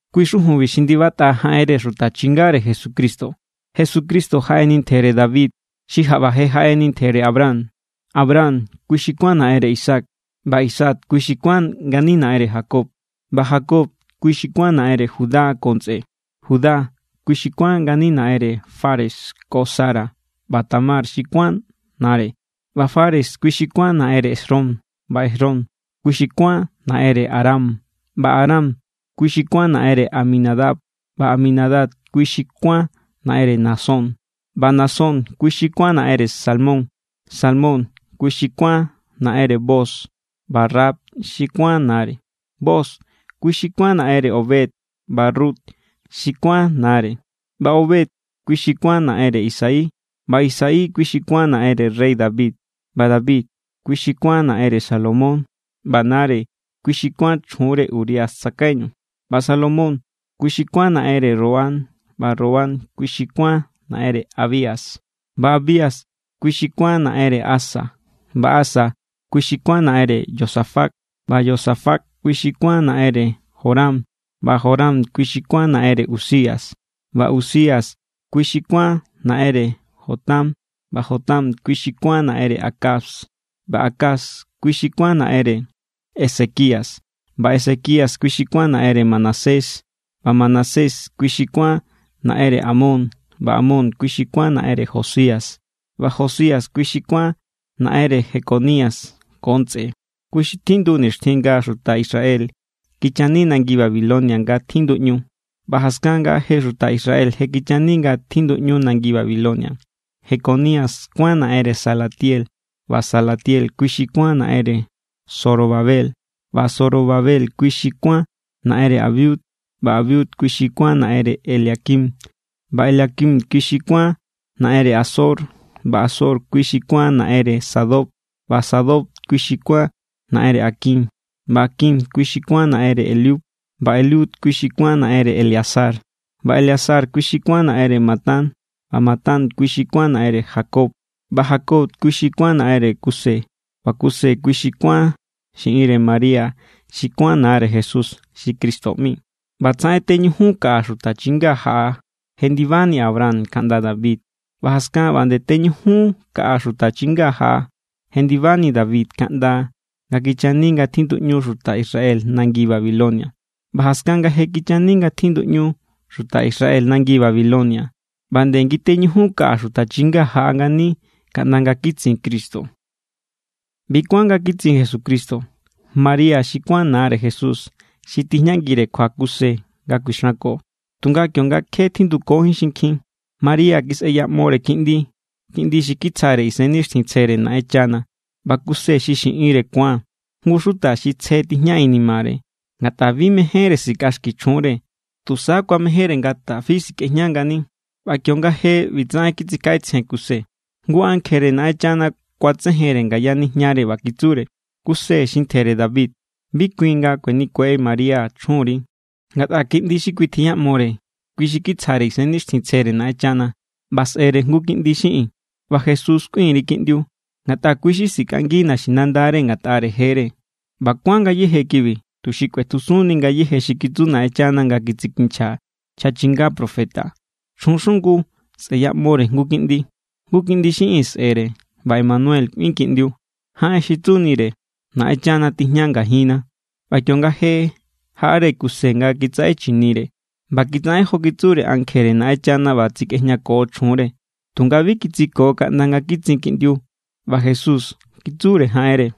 Kui= xujunbi xi ndibatꞌa jaꞌenre xuta chingare Jesucristo. Jesucristo jaꞌeni ntjere David xi jaꞌba je jaꞌeni ntjere Abraham. Abraham, kui xi kuán naꞌenre Isaac. ꞌBa Isaac, kui xi kuán ngani naꞌenre Jacob. ꞌBa Jacob, kui xi kuán naꞌenre Judá ko ntsꞌe. Judá, kui xi kuán ngani naꞌenre Fares ko Zara ꞌba Tamar xi kuán nare. ꞌBa Fares, kui xi kuán naꞌenre Esrom. ꞌBa Esrom, kui xi kuán naꞌenre Aram. ꞌBa Aram, kui xi kuán naꞌenre Aminadab. ꞌBa Aminadab, kui xi kuán naꞌenre Naasón. ꞌBa Naasón, kui xi kuán naꞌenre Salmón. Salmón, kui xi kuán naꞌenre Booz ꞌba Rahab xi kuán nare. Booz, kui xi kuán naꞌenre Obed ꞌba Rut xi kuán nare. ꞌBa Obed, kui xi kuán naꞌenre Isaí. ꞌBa Isaí, kui xi kuán naꞌenre rey David. ꞌBa David, kui xi kuán naꞌenre Salomón ꞌba nare kui xi kuán chjunre Urías tsakaiñu. ꞌBa Salomón, kui xi kuán naꞌenre Roboam. ꞌBa Roboam, kui xi kuán naꞌenre Abías. ꞌBa Abías, kui xi kuán naꞌenre Asa. ꞌBa Asa, kui xi kuán naꞌenre Josafat. ꞌBa Josafat, kui xi kuán naꞌenre Joram. ꞌBa Joram, kui xi kuán naꞌenre Uzías. ꞌBa Uzías, kui xi kuán naꞌenre Jotam. ꞌBa Jotam, kui xi kuán naꞌenre Acaz. ꞌBa Acaz, kui xi kuán naꞌenre Ezequías. ꞌBa Ezequías, kui xi kuán naꞌenre Manasés. ꞌBa Manasés, kui xi kuán naꞌenre Amón. ꞌBa Amón, kui xi kuán naꞌenre Josías. ꞌBa Josías, kui xi kuán naꞌenre Jeconías ko ntsꞌe, kui xi tjindu nixtjin nga xuta Israel kichani nangi Babilonia nga tjinduꞌñu. ꞌBa jaskan nga je xuta Israel je kichani nga tjinduꞌñu nangi Babilonia, Jeconías kuán naꞌenre Salatiel. ꞌBa Salatiel, kui xi kuán naꞌenre Zorobabel. ꞌBa Zorobabel, kui xi kuán naꞌenre Abiud. ꞌBa Abiud, kui xi kuán naꞌenre Eliaquim. ꞌBa Eliaquim, kui xi kuán naꞌenre Azor. ꞌBa Azor, kui xi kuán naꞌenre Sadoc. ꞌBa Sadoc, kui xi kuán naꞌenre Aquim. ꞌBa Aquim, kui xi kuán naꞌenre Eliud. ꞌBa Eliud, kui xi kuán naꞌenre Eleazar. ꞌBa Eleazar, kui xi kuán naꞌenre Matán. ꞌBa Matán, kui xi kuán naꞌenre Jacob. ꞌBa Jacob, kui xi kuán naꞌenre Kuse. ꞌBa Kuse, kui xi kuán xiꞌinre María xi kuán nare Jesús xi Cristo ꞌmi. ꞌBa ꞌbatsaꞌen teñujun kaꞌa xuta chinga jaꞌa jendibani Abraham kaꞌnda David. ꞌBa jaskan ꞌba nde teñujun kaꞌa xuta chinga jaꞌa jendibani David kaꞌnda nga kichani nga tjinduꞌñu xuta Israel nangi Babilonia. ꞌBa jaskan nga je kichani nga tjinduꞌñu xuta Israel nangi Babilonia, ꞌba nde ngiteñujun kaꞌa xuta chinga jaꞌa ngani kaꞌnda nga kitsin Cristo. ꞌBi= kuán nga kitsin Jesucristo: María xi kuán nare Jesús xi tijñangire kjua Kuse nga kuixanko. Tunga kionga kje tjindukojín xinkjin, María kisꞌeyaꞌmore kiꞌndi, kiꞌndi xi kitsjare Isennixtjintsjere Naꞌenchana. ꞌBa Kuse xi xiꞌinre ku̱an, jngu xuta xi tsje tijña inimare. Ngatꞌa bi mejénre sikꞌaxki chjunre, tusa kuamejénre nga tafi sikꞌejña ngani. ꞌBa kionga je ꞌbitsaꞌen kitsikjaꞌetsjen Kuse, jngu ankjere Naꞌenchana kuatsejenre ngaya nijñare ꞌba kitsure: —Kuse xi ntjere David, bi kuin nga kuenikue María chjunri. Ngatꞌa kiꞌndi xi kui tjiyaꞌmore, kui xi kitsjare Isennixtjintsjere Naꞌenchana. ꞌBa sꞌe̱re jngu kiꞌndi xiꞌin, ꞌba Jesús kꞌuin_ri kiꞌndiu. Ngatꞌa kui= xi sikꞌangi naxinandare ngatꞌare jere. ꞌBa kuán ngayéje kibi, tuxi kꞌuetjusunni ngayéje xi kitsu Naꞌenchana nga kitsikinchja nchja chinga profeta: Chjun xungu sꞌe̱yaꞌmore jngu kiꞌndi, jngu kiꞌndi xiꞌin sꞌe̱re, ꞌba Emanuel kꞌuin kiꞌndiu. Jaꞌen xi tsunire: Naꞌenchana tijña ngajinna. ꞌBa kionga je jaꞌare Kuse nga kitsaꞌe chinire, ꞌba kitsaꞌen jo kitsure ankjere Naꞌenchana ꞌba tsikꞌejñako chjunre. Tunga bi kitsiko kaꞌnda nga kitsin kiꞌndiu, ꞌba Jesús kitsure jaꞌenre.